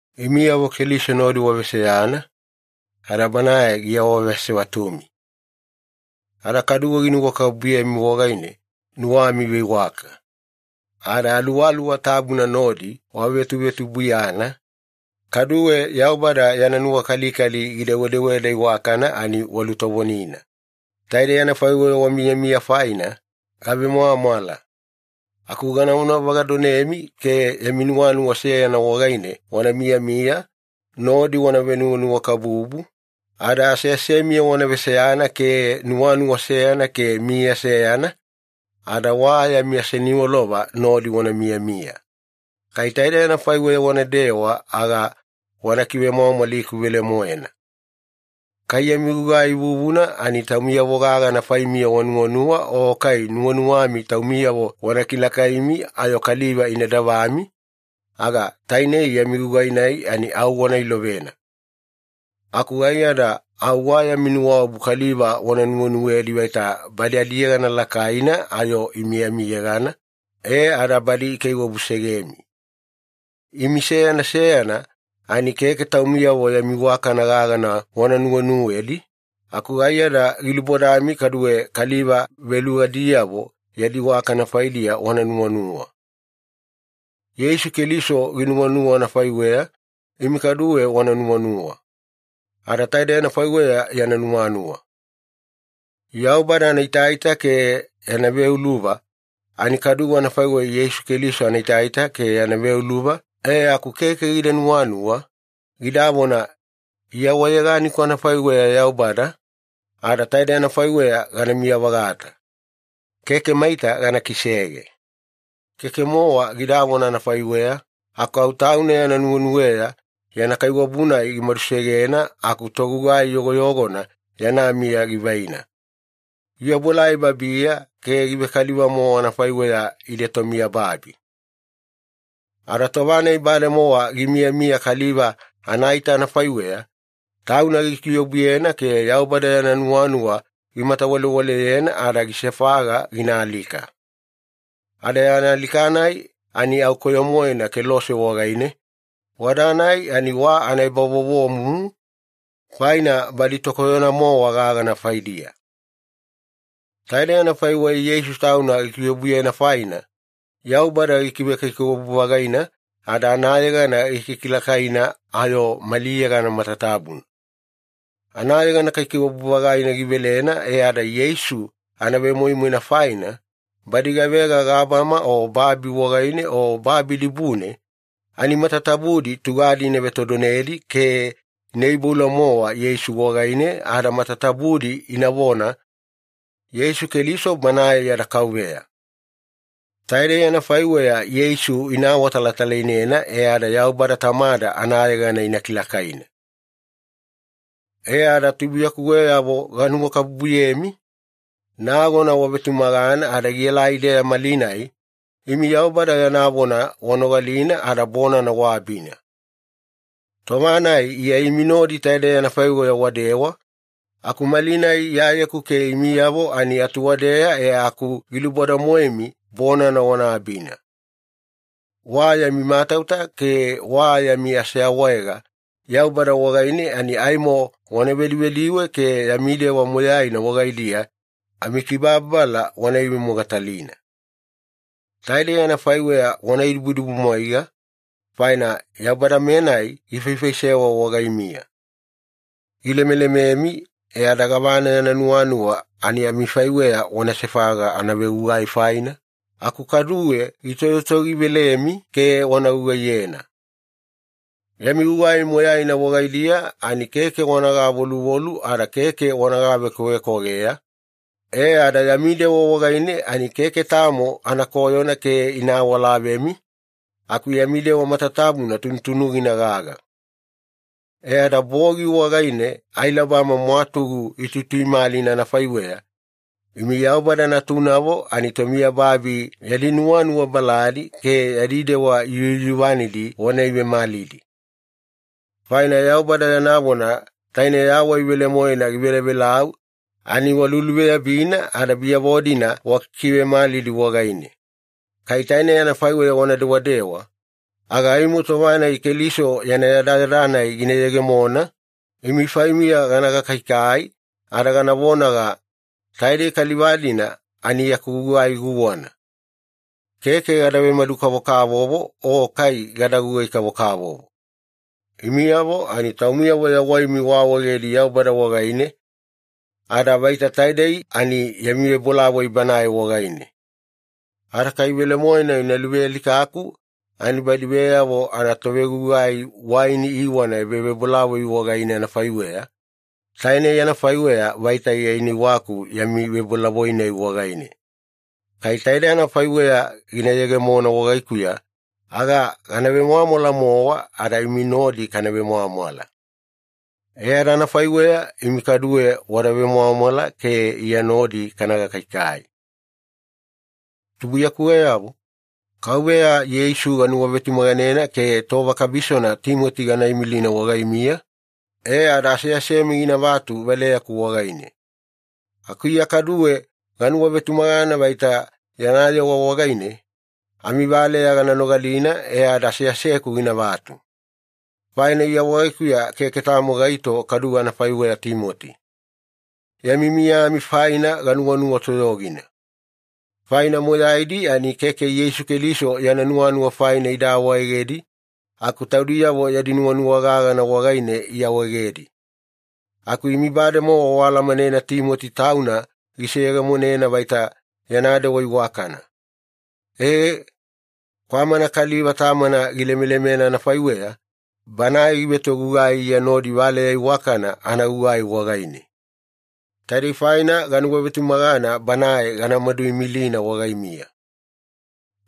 Imiyavo Keliso nodi waveseyana, ada Banae giawaasevatumi. Ada kaduwe ginuwakabubuyemi wagaine nuwami iveiwaka. Ada Aluwaluwa Tabuna nodi wavetuvetubuiyana, kaduwe Yaubada wa yana nuwakalikali gidewedeweda iwakana ani walutovonina. Taidei anafaiweya wamiyamiya faina, gavemwamwala. Aku ganavona vagadonemi ke yami nuwanuwa seyana wagaine wana miyamiya, nodi wana venuwanuwakabubu, ada aseasemiya wana veseyana ke nuwanuwa seyana ke miya seyana, ada wa yami aseniwalova nodi wana miyamiya. Kai taidei anafaiweya wanadewa aga wana kivemwamwaliku velemoena. Kai yami gugai vuvuna ani taumiyavo gagana faimiya wanuwanuwa o kai nuwanuwami taumiyavo wana kilakaimi ayo kaliva ina davami, aga tainei yami gugai-nai ani au wana ilovena. Aku aiyada au wa yami nuwaobu kaliva wana nuwenuwedi vaita badi adiyegana lakaina ayo imi amiyegana, e ada badi ikaiwabusegemi. Imi seyana seyana ani keke taumiyavo yami iwakana gagana wana nuwenuwedi, aku aiyada gilubodami kaduwe kaliva velugadiyavo yadi iwakana faidiya wana nuwanuwa. Yeisu Keliso ginuwanuwa anafaiweya, imi kaduwe wana nuwanuwa. Ada taidei anafaiweya yana nuwanuwa. Yaubada anaitaita ke yana veuluva ani kadu anafaiweya Yeisu Keliso anaitaita ke yana veuluva, e aku keke gida nuwanuwa, gidavona, “Iya wa yeganiku anafaiweya Yaubada, ada taidei anafaiweya ganamiya-vagata. Keke maita gana kisege.” Keke-mowa gidavona anafaiweya, aku au Tauna yana nuwenuweya yana kaiwabu-nai gimadusegena aku togugai yogoyogona yana miya givaina. Giobuelai babiya ke givekaliva-mowa anafaiweya ide tomiyababi. Ada tova-nai bademowa gimiyamiya kaliva anaita anafaiweya, Tauna gikiobuyena ke Yaubada yana nuwanuwa gimatawalewaleyena ada gisefaga gina alika. Ada yana alika-nai ani au koyo-moena kelose wagaine, wada-nai ani wa anaebavovomumu, faina badi tokoyona-mowa gagana faidiya. Taide anafaiweya Yeisu Tauna gikiobuyena faina, Yaubada gikivekaikaiwabu-vagaina ada anayegana gikilakaina ayo mali yegana matatabuna. Anayegana kaikaiwabu-vagaina givelena e ada Yeisu anavemoimoina faina, badi gavega gabama o babi wagaine o babi dibune, ani matatabudi tugadi ina vetodonedi ke ina iboula-mowa Yeisu wagaine ada matatabudi inavona, “Yeisu Keliso Banae yada Kauveya.” Taidei anafaiweya Yeisu ina awatalatalainena e ada Yaubada Tamada anayegana ina kilakaina. E ada tubuiyakuweyavo ganuwakabubuyemi, nagona wavetumagana ada gielai-deya malinai, imi Yaubada yana vona wanogalina ada bonana waabina. Tova-nai Iya imi nodi taidei anafaiweya wadewa, aku malinai Iyayeku ke imiyavo ani atuwadeya e aku giluboda-moemi bonana wana abina. Wa yami matauta ke wa yami aseawaega Yaubada wagaine ani aimo wana vedivediwe ke yami dewa moyaina wagaidiya amikibababala wana ivemogatalina. Taidei anafaiweya wana idibudibumwaiga, faina Yaubada-menai gifaifaisewa wagaimiya. Gilemelememi e ada gavana yana nuwanuwa ani amifaiweya wana sefaga anavegugai faina, aku kaduwe gitoyotoyogivelemi ke wana gugaiyena. Yami gugai moyaina wagaidiya ani keke wana gavoluvolu ada keke wana gavekwavekwageya, e ada yami dewa wagaine ani keke tamo anakoyona ke ina awalavemi, aku yami dewa matatabuna tunutunugina gaga. E ada bogi wagaine ailabama mwatugu ituituimalina anafaiweya, imi Yaubada natunavo ani tomiyababi yadi nuwanuwa baladi ke yadi dewa yuyuvanidi wana ivemalidi. Faina Yaubada yana vona taine yawai velemoena givelavelau ani waluluveyabina ada biyavo-dina wakikivemalidi wagaine. Kai tainei anafaiweya wana dewadewa, aga aimo tova-nai Keliso yana yadayada-nai gina yegemona, imi faimiya gana gakaikai ada gana vonaga, “Taidei kaliva-dina ani yaku gugai guwana. Keke gada vemadu-kavokavovo o kai gada gugai-kavokavovo.” Imiyavo ani taumiyavo yawaimi waawaegedi Yaubada wagaine, ada vaita taidei ani yami vebolavoi Banae wagaine. Ada kai velemoena ina luvealikaku ani badi veyavo anatovegugai waini iiwana ebavebolavoi wagaine anafaiweya, tainei anafaiweya vaita Iya ina iwaku yami vebolavoi-nai wagaine. Kai taide anafaiweya gina yegemona wagaikuya, aga gana vemwamwala-mowa ada imi nodi kana vemwamwala. E ada anafaiweya imi kaduwe wada vemwamwala ke Iya nodi kana gakaikai. Tubuiyakuweyavo, Kauveya Yeisu ganuwavetumaganena ke tova kabisona Timoti gana imilina wagaimiya, e ada aseasemi ginavatu valeyaku wagaine. Aku Iya kaduwe ganuwavetumagana vaita yana yewa wagaine, amivaleya gana nogalina e ada aseaseku ginavatu. Faina Iya wagaikuya keke tamo gaito kaduwe anafaiweya Timoti. Yami miyami faina ginuwanuwa toyogina. Faina moyaidi ani keke Yeisu Keliso yana nuwanuwa faina ida awaegedi, aku taudiyavo yadi nuwanuwa gagana wagaine iawaegedi. Aku imi bademowa waalamanena Timoti tauna giseyegemonena vaita yana dewa iwakana. E, kwamana kaliva tamana gilemelemena anafaiweya, banae givetogugai Iya nodi valeya iwakana anagugai wagaine. Taidei faina ganuwavetumagana banae ganamadu imilina wagaimiya.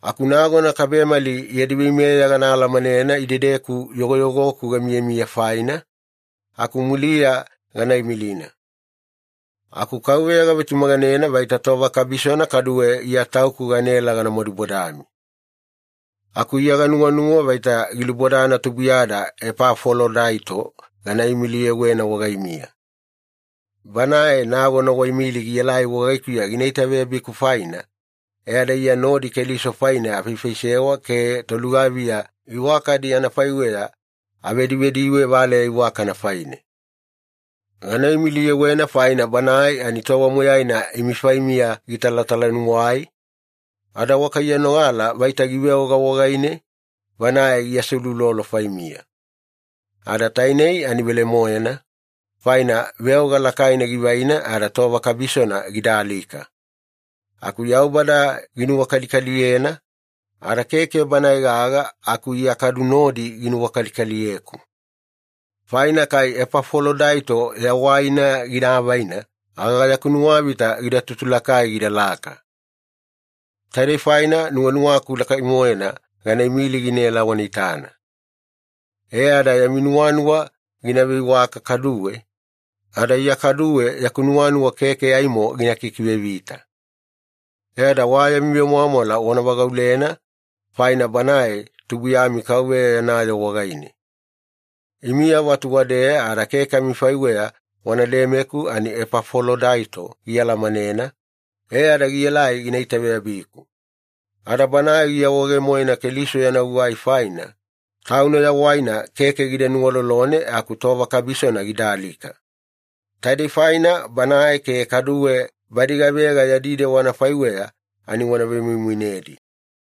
Aku nagona kabemali yadi veimeya gana alamanena idedeku yogoyogoku gamiyamiya faina, aku muliya gana imilina. Aku Kauveya gavetumaganena vaita tova kabisona kaduwe Iya tauku ganaela gana madubodami. Aku Iya ganuwanuwa vaita gilubodana tubuiyada Epafolodaito gana imiliyewena wagaimiya. Banae nagona waimili gielai wagaikuya gina itaveyabiku faina, e ada Iya nodi Keliso faine afaifaisewa ke tolugaviya iwakadi anafaiweya avedivediwe valeya iwakana faine. Gana imiliyewena faina banae ani tova moyaina imi faimiya gitalatalanuwai, ada wakaiyanogala vaita giveoga wagaine, banae giaseuloulolo faimiya. Ada tainei ani velemoena, faina veoga lakaina givaina ada tova kabisona gida alika. Aku Yaubada ginuwakalikaliyena, ada keke banae gaga aku Iya kadu nodi ginuwakalikaliyeku. Faina kai Epafolodaito yawaina gida avaina aga yaku nuwavita gida tutulakai gidalaka. Taidei faina nuwanuwaku lakai-moena gana imili ginaela wana itana. E ada yami nuwanuwa gina veiwaka kaduwe, ada Iya kaduwe yaku nuwanuwa keke aimo gina kikivevita. E ada wa yami vemwamwala wana vagaulena, faina banae tubuiyami Kauveya yana yoo wagaine. Imiyavo atuwadeya ada keke amifaiweya wana lemeku ani Epafolodaito gialamanena, e ada gielai gina itaveyabiku. Ada banae giawaege-moena Keliso yana gugai faina, tauna yawaina keke gida nuwalolone aku tova kabisona gida alika. Taidei faina banae ke kaduwe badi gavega yadi dewa anafaiweya ani wana vemoimoinedi.